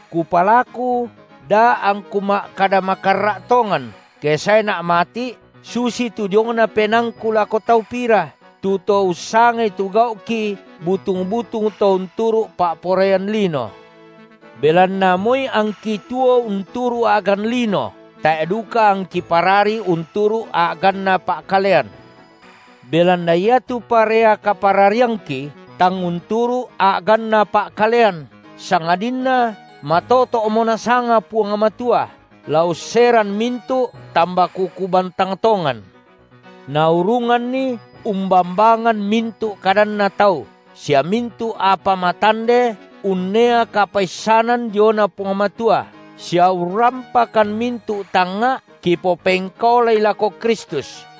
Kupalaku da angku ma’kada makarra’ tongan, ke saena’ mati’ susitu diongna penaangku lako tau pira, tu to ussangai tu gau’ki butung-butung to unturu’ pa’poraian lino. Belanna moi angki tuo unturu’ a’gan lino, tae’ duka angki parari unturu’ a’ganna pa’kalean. Belanna iatu parea kaparariangki tang unturu’ a’ganna pa’kalean, sangadinna matoto’mo Nasanga Puang Matua, la usseran mintu’ tambakuku bantang tongan. Naurunganni umbambangan mintu’ kadanna tau, sia mintu’ apa matande unnea kapaissanan diona Puang Matua, sia urrampakan mintu’ tangnga’ kipopengkaolai lako Kristus;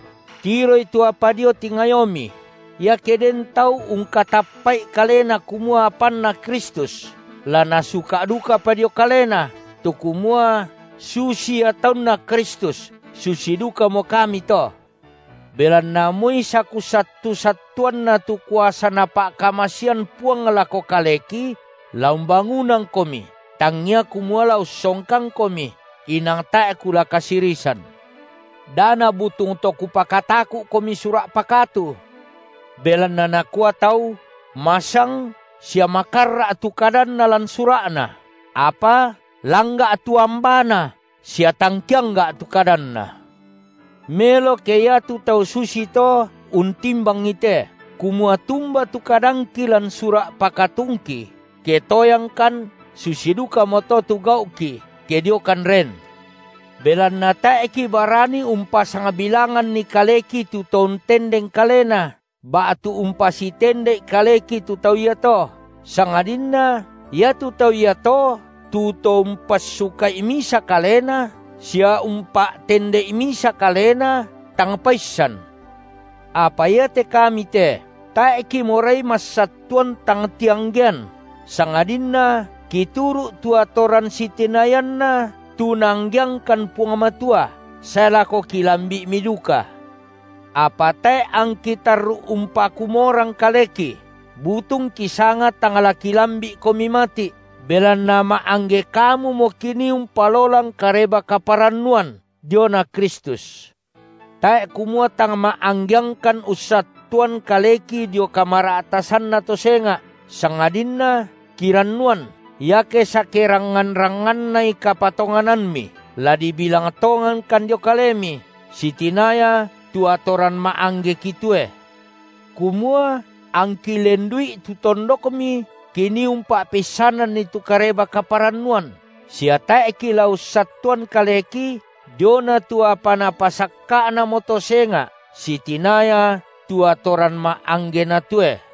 Tiroi tu apa dio tingayomi. Iake den tau ungkatappa’i kalena kumua apanNa Kristus, la nasuka’ dukapa dio kalena, tu kumua, susi ia taunNa Kristus susi dukamo kami to. Belanna moi sakusattu-sattuanna tu kuasa Napa’kamasean Puang lako kaleki, la umbangunangkomi tangngia kumua la ussongkangkomi, inang tae’ kula kasirisan. Da nabutung to kupakataku’komi sura’ pakatu. Belanna nakua tau, masang sia makarra’ tu kadanna lan sura’na, apa langga’ tu ambana sia tang keangga’ tu kadanna. Melo ke iatu tau susito untimbangi te, kumua tumba tu kadangki lan sura’ pakatungki, ke toyangkan, susi dukamoto tu gau’ki ke diokan ren. Belanna tae’ kibarani umpasangbilanganni kaleki tu to untendeng kalena, ba’tu umpasitende’i kaleki tu tau iato, sangadinna iatu tau iato tu to umpassuka’i misa kalena sia umpa’tende’i misa kalena, tang paissan. Apa iate kami te tae’ kimorai massattuan tang tianggean, sangadinna kituru’ tu atoran sitinayanna tu Naanggeangkan Puang Matua, sae lako kilambi’mi duka. Apa tae’ angki tarru’ umpakumorang kaleki, butung kisanga tang la kilambi’komi mati’, belanna ma’angge kamumo kinii umpalolang Kareba-kaparannuan diona Kristus. Tae’ kumua tang ma’anggeangkan ussattuan kaleki dio kamara’tasanna to senga’, sangadinna kirannuan iake sakerangngan-rangngannai kapatonganammi, la dibilang tongankan dio kalemi, sitinaya tu atoran ma’angge kitoe. Kumua angki lendu’i tu tondokmi kinii umpa’peissananni tu Kareba-kaparannuan, sia tae’ kila ussattuan kaleki diona tu apa napasakka’namo to senga’ sitinaya tu atoran ma’angge natoe.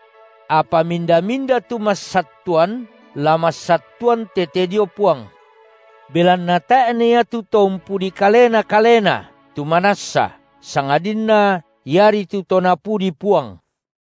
Apa minda-minda tu massattuan, la massattuan tete dio Puang. Belanna tae’ na iatu to umpudi kalena kalena tu manassa, sangadinna iari tu to Napudi Puang.